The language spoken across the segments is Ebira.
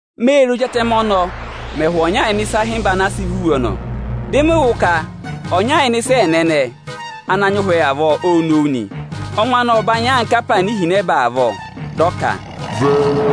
Mê re, Ózi Atẹmẹ ọnọọ mẹ̀ hụ̀ ọnya ịnị ịsa ịhịmba ana a sị vá iwe ọnọọ. Dị mị wụ́ ka ọnya ịnị ịsa ẹẹna ẹnẹẹ ana nyị ụhwẹ avọọ, ô nowu nị. Ọngwẹ anị ộ banyị anka apaana ihinẹba avọọ. Dị ọ ka: Vẹ!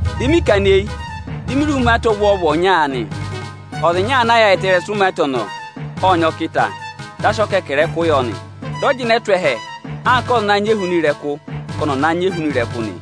Dị mị kana eyi, di mi re ka umaata ọvwọọvụ ọnya nị. Ọza ana tụra umaata ọnọọ, ộ sị ọkịta rị ụvọ, dị a sị ọkẹkẹrẹkụ yọ nị. Dị ọ jịnẹ tụ́ ẹhẹ anka ọza anaā nyị ehuna ịrẹkụ avọọ ka ọnị ọ̀ na nyị ehuna ịrẹkụ nị.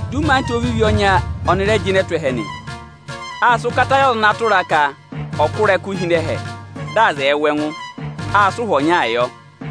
Dị umaata ovivi ọnya ọnị rẹ jịnẹ tụ́ ẹhẹ nị. Â sị ụkata yị ọza ana tụra a ka ọ̀ kụ́ ịrẹkụ hi ịnị ẹhẹ, dị aza ẹẹ wụ ẹngụ nị. Â sị ụhwọ ọnyaa yọ.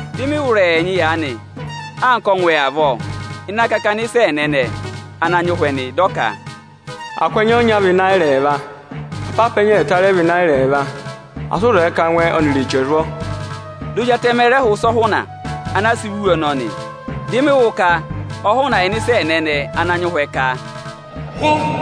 Dị mị wụ́ ịrẹyị ẹnyị aanị anka ọngwẹ avọọ ịnị akakana ịsa ẹẹna ẹnẹẹ ana nyị ụhwẹ nị. Dị ọ ka: Akụ ẹnya ọnya vị Ịnayịra ẹẹva, apaapa ẹnya ẹẹta rẹ vị Ịnayịra ẹẹva. Asị ụ zẹẹ ka angwẹ ọnịrị eche ẹ̀ zwọ! Di Ozi Atẹmẹ ọnọọ rẹ hụ̀ ịsa ọhụna ana a sị vá iwe ọnọọ nị. Dị mị wụ́ ka ọhụna ịnị ịsa ẹẹna ẹnẹẹ ana nyị ụhwẹ ka: Vẹ! nị.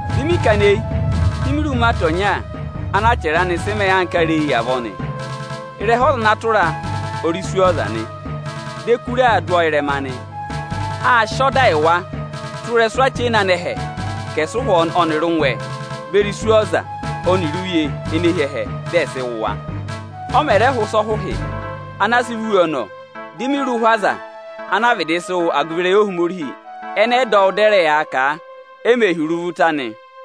Dị mị kana eyi, di mi re umaata ọnya ana achẹrẹ anị sị mẹẹ anka areyi avọọ nị. Ịrẹha ọza ana tụra a ọ rị Iswọọza nị. Di ẹkụra aa dụ ọ ịrẹma nị. Â sị ọda yị wa tụ́ ịrẹsụ achena anẹhẹ ka ẹ̀ sị ịrẹkụ ọnịrị ụngwẹ beri ụkụ ọnịrị uye edivi ene hi ẹhẹ, dị ẹ̀ sị wụ̀ wa nị. Ọ mẹ̀ rẹ hụ̀ ịsa ọhụhị ana a sị vá iwe ọnọọ, di mi re ụhwẹ aza ana vịdị sị wụ agụvị ịrẹyị Ohomorihi ẹnẹ ẹ dọ wụ dị ẹ rẹ yaa kà a e mè hi iruvo ụta nị.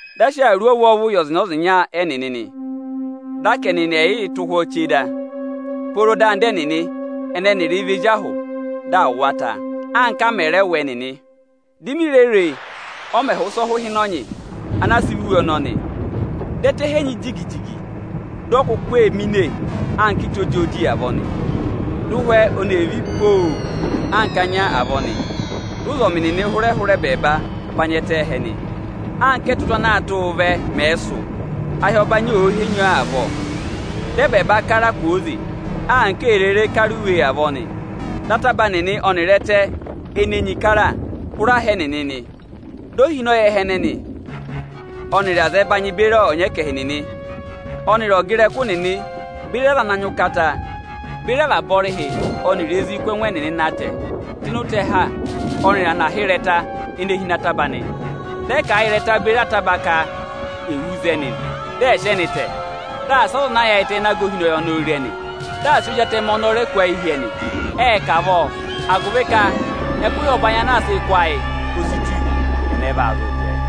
Dị a sị awuru ọvwọọvụ yị ọzịnya-ọzịnya ẹnịnị nị. Dị a ka ẹnịnị ẹ̀yịị tụ́ ụhwọ́ chee da, pooro dị anda ẹnịnị ẹnẹ ẹnịrịị vị ezi ahụ, dị à wụ̀ wa ta, anka a mẹ̀ rẹ wụ ẹnị nị. Di mi re re, ọ mẹ̀ hụ̀ ịsa ọhụhịnọnyị ana a sị vá iwe ọnọọ nị. Dị ẹtẹ henyi jigi-jigi, dị ọyị kuku ee mine anka ịta ojooji avọọ nị. Dị ụhwẹ ọnị ee ví pooo anka anya avọọ nị. Dị ụzọmị nịnị hụrẹ hụrị ẹbẹẹba va nya ẹtẹ ẹhẹ nị, anka ẹ́tụtụ ana aa tụ́ụ vẹ mẹ̀ẹ sụ̀, ahị ọbanyị òo henyi ọọ avọọ nị. Dị ẹbẹẹba kara kwooze, anka èe rere kara iwe kwooze avọọ nị. Dị ataba nịnị ẹnịrị ẹtẹ ene enyi kara, hụrẹ aha ẹnịnị nị. Di ohinọyị nịnị ẹnịrị azẹbanyị beri ọnyẹkẹhị nịnị ẹnịrị ọga ịrẹkụ nịnị beri aza ana nyị ụkata, beri avaba ọrịhị ẹnịrị ezi kụ́ ẹngụ ẹnịnị na tẹ̀ ịnị ụtẹha ọnịrị ịnị anaha ịrẹta ene hi ịnị ataba nị. Dị ẹ kà a yị ịrẹta beri ataba ka è wú za ẹnị, dị ẹ̀ sị ẹnị tẹ̀, dị asị ọza ana yaayịtẹ ịnị aga ohinọyị ọnọọ re ẹnị, dị asị Ozi Atẹmẹ ọnọọ rẹ kụ́ ayị hi ẹnị nị. Ệ kà avọọ, agụvị ka ẹkụhị ọbanyị ana aa sịị kụ́ ayị, o si tù; ẹnẹ va zụụ jẹẹ?